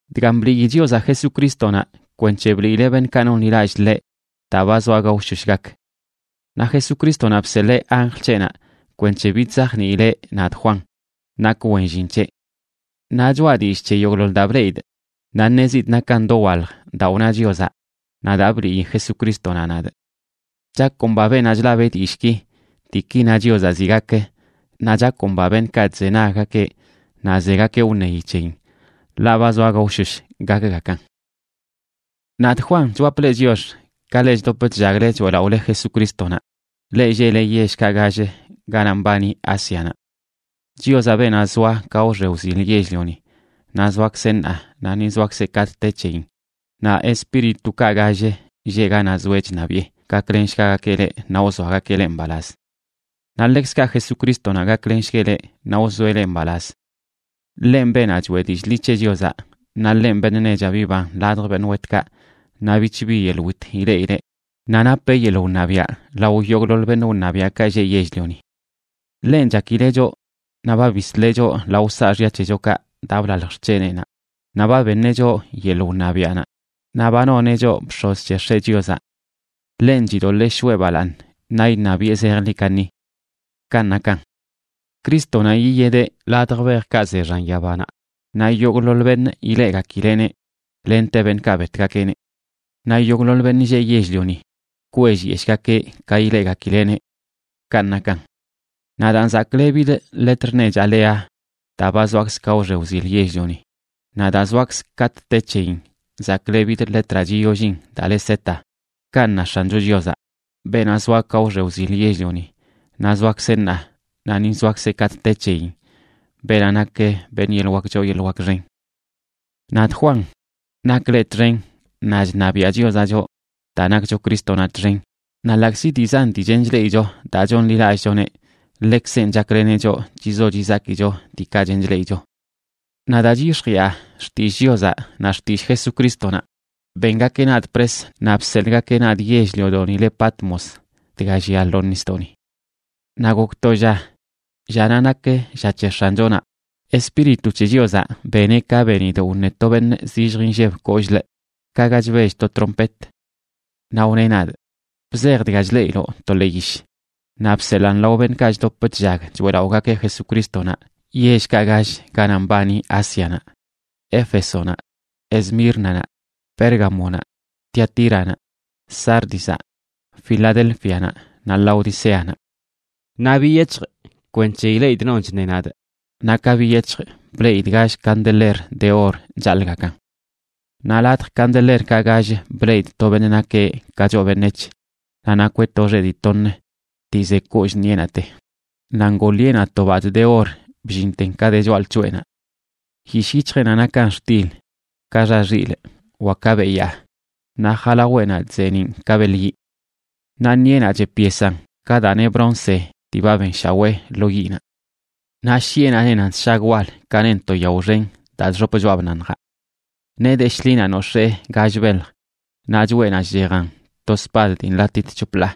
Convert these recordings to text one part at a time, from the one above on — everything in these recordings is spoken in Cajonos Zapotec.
Dgan blii Chiozaꞌ Jesucrístonaꞌ kwenc̱he bliileꞌ beṉꞌkaꞌ nonḻilallꞌ ḻeꞌ daa ba zoa gaoshosh gak. Naꞌ Jesucrístonaꞌ bseḻee anjl c̱heꞌnaꞌ kwenc̱he bidzajniileꞌ nadꞌ Juan, nakꞌ wen llin c̱heꞌ. Naꞌ choꞌa dillꞌ c̱he yogꞌḻoḻ daa bleꞌidꞌ, naꞌ ṉezidꞌ nakan dowalj daa wna Chiozaꞌ naꞌ daa bliꞌyi Jesucrístonaꞌ nadꞌ. Chakomba beenaꞌ chlab dillꞌki, diiki na Chiozaꞌ ziꞌ gak, naꞌ chakomba beṉꞌkaꞌ chzenaggakeꞌ naꞌ zegakeꞌ wṉeyi c̱heyin, ḻaꞌ ba zoa gaoshosh gakgakan. Nadꞌ Juan chwapꞌ leꞌ chiox, ka leꞌ chdop chllagle choeꞌlaꞌole Jesucrístonaꞌ, leꞌ lleꞌle yellkaꞌ gall ganaꞌ mbani Ásianaꞌ. Chiozaꞌ, beenaꞌ zoa ka wxe wzil yell-lioni, naꞌ zoakzeꞌ ṉaa, naꞌ ni zoakzeꞌ katꞌ te c̱heyin, naꞌ espíritukaꞌ gall lleꞌ ganaꞌ zoeꞌ chṉabiꞌe, gaklenshgagakeꞌ leꞌ naꞌ wzoagakeꞌ leꞌ mbalaz. Naꞌ ḻekzkaꞌ Jesucrístonaꞌ gaklenshgueꞌ leꞌ naꞌ wzoeꞌ leꞌ mbalaz. Ḻenꞌ beenaꞌ choeꞌ dillꞌ ḻi c̱he Chiozaꞌ, naꞌ ḻenꞌ beṉꞌ nechaꞌ biban ladj beṉꞌ wetkaꞌ naꞌ bich bi yeḻꞌ wit ileꞌileꞌ, naꞌ napeꞌ yeḻꞌ wṉabiaꞌ lao yogꞌḻoḻ beṉꞌ wṉabiaꞌkaꞌ lleꞌ yell-lioni. Ḻenꞌ chakileꞌ choꞌ naꞌ ba bisleꞌ choꞌ lao saaxya c̱hechokaꞌ daa blalj xc̱heneꞌnaꞌ, naꞌ ba beṉeꞌ choꞌ yeḻꞌ wṉabiaꞌnaꞌ, naꞌ ba noneꞌ choꞌ bx̱oz c̱he X̱eꞌ Chiozaꞌ. Ḻenꞌ chidoḻee shoꞌe balaaṉ naꞌ iṉabiꞌe zejḻi kaṉi. Kanꞌ nakan. Crístonaꞌ yiyedeꞌ ladj bejkaꞌ ze xan yabanaꞌ, naꞌ yogꞌḻoḻ beṉꞌ ileꞌgakileꞌneꞌ, lente beṉꞌkaꞌ betgakeꞌneꞌ. Naꞌ yogꞌḻoḻ beṉꞌ lleꞌ yell-lioni kwellyeshꞌgakeꞌ ka ileꞌgakileꞌneꞌ. Kanꞌ nakan. “Nadaan zaklebidꞌ letr nechaꞌ le Aa daa ba zoakzꞌ ka wxe wzil yell-lioni, naꞌ daa zoakzꞌ katꞌ te c̱heyin zaklebidꞌ letraꞌ chiyollin daa le Z”,b kanꞌ na X̱ancho Chiozaꞌ, beenaꞌ zoa ka wxe wzil yell-lioni, naꞌ zoakzeꞌ ṉaa, naꞌ ni zoakzeꞌ katꞌ te c̱heyin, beenaꞌ nak beṉꞌ yeḻꞌ wak choo yeḻꞌ wak xen. Nadꞌ Juan, nakꞌ leꞌ txen, naꞌ chṉabiaꞌ Chiozaꞌ choꞌ daa nakcho Crístonaꞌ txen naꞌ ḻaꞌkzi dii zan dii chen chleꞌicho daa chonḻilallꞌchoneꞌ, ḻekzenꞌ chakleneꞌ choꞌ chizo chizakicho diikaꞌ chen chleꞌicho. Naꞌ daa chyix̱jiꞌa xtillꞌ Chiozaꞌ naꞌ xtillꞌ Jesucrístonaꞌ bengakeꞌ nadꞌ pres naꞌ bseḻꞌgakeꞌ nadꞌ yell-liodoꞌni le Patmos, dga llia lo nisdoꞌni. Naꞌ gok to lla, llanaꞌ nak lla c̱he X̱anchonaꞌ, Espíritu c̱he Chiozaꞌ beneꞌ ka benidꞌ wṉe to beṉꞌ zillj inlleb kollꞌləꞌ, ka ga chbell to trompet. Naꞌ wneꞌ nadꞌ: ―Bzej dga chleꞌiloꞌ to ḻee yish, naꞌ bseḻaan lao beṉꞌkaꞌ chdop chllag choeꞌlaꞌogakeꞌ Jesucrístonaꞌ yellkaꞌ gall ganaꞌ mbani Ásianaꞌ: Éfesonaꞌ, Esmírnanaꞌ, Pérgamonaꞌ, Tiatíranaꞌ, Sárdizaꞌ, Filadélfianaꞌ, naꞌ Laodiceanaꞌ. Naꞌ biyec̱hjꞌ kwenc̱he ileꞌidꞌ non chṉe nadꞌ, naꞌ ka biyec̱hjꞌ bleꞌidꞌ gall candeler de or chaḻꞌgakan. Naꞌ ladj candelerkaꞌ gall bleꞌidꞌ to beṉꞌ nakeꞌ ka choꞌ beṉec̱h, naꞌ nakweꞌ to xeꞌ dii toṉ dii ze kollꞌ ṉiꞌenaꞌte, naꞌ ngoo ḻiꞌenaꞌ to badꞌ de or bllinten ka de choꞌalc̱hoꞌenaꞌ. Yishꞌ yic̱hjeꞌnaꞌ nakan xtil ka xa xilꞌ wa ka beyaa, naꞌ jalaweꞌnaꞌ chzeeniꞌn ka beḻ yiꞌ. Naꞌ ṉiꞌenaꞌ chep yesan ka daa neꞌ bronce dii ba benshawee lo yiꞌnaꞌ. Naꞌ shiꞌenaꞌ nenan sshag wal ka nen to yao xen daa chxop choꞌa bnaṉjaꞌ. Nee de shḻinaꞌ nox̱ee gall belj, naꞌ choꞌenaꞌ chchejan to spad dii nḻatit c̱hop ḻaa.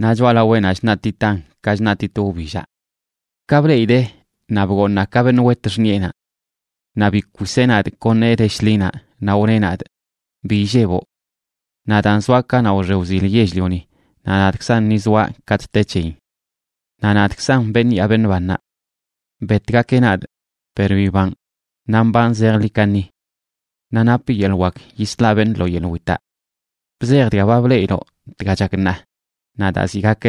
Naꞌ choꞌalaweꞌnaꞌ chṉaꞌtitan ka chṉaꞌtit wbillaꞌ. Ka bleꞌidee, naꞌ bgooṉaa ka beṉꞌ wet xṉiꞌenaꞌ. Naꞌ bikwiseꞌ nadꞌ kon nee de shḻinaꞌ, naꞌ wneꞌ nadꞌ: ―Bi illeboꞌ. Nadaan zoaꞌ kanaꞌ wxe wzil yell-lioni naꞌ nadꞌkzan ni zoaꞌ katꞌ te c̱heyin. Naꞌ nadꞌkzan beṉꞌ yaa beṉꞌ bannaꞌ. Betgakeꞌ nadꞌ, per bibanꞌ naꞌ mbanꞌ zejḻi kaṉi. Naꞌ napꞌ yeḻꞌ wak yislaꞌ beṉꞌ lo yeḻꞌ witaꞌ. Bzej dga ba bleꞌiloꞌ, dga chak ṉaa, naꞌ daa ziꞌ gak.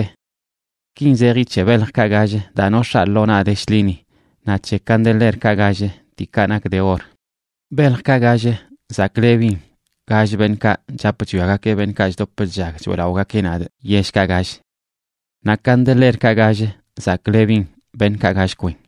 Kin zeji c̱he beljkaꞌ gall daa nox̱aa lo naꞌ de shḻini naꞌ c̱he candelerkaꞌ gall diikaꞌ nak de or: beljkaꞌ gall zaklebin gall beṉꞌkaꞌc chap chwiagakeꞌ beṉꞌkaꞌ chdop chllag choeꞌlaꞌogakeꞌ nadꞌ yellkaꞌ gall. Naꞌ candelerkaꞌ gall zaklebin beṉꞌkaꞌ gall kwen.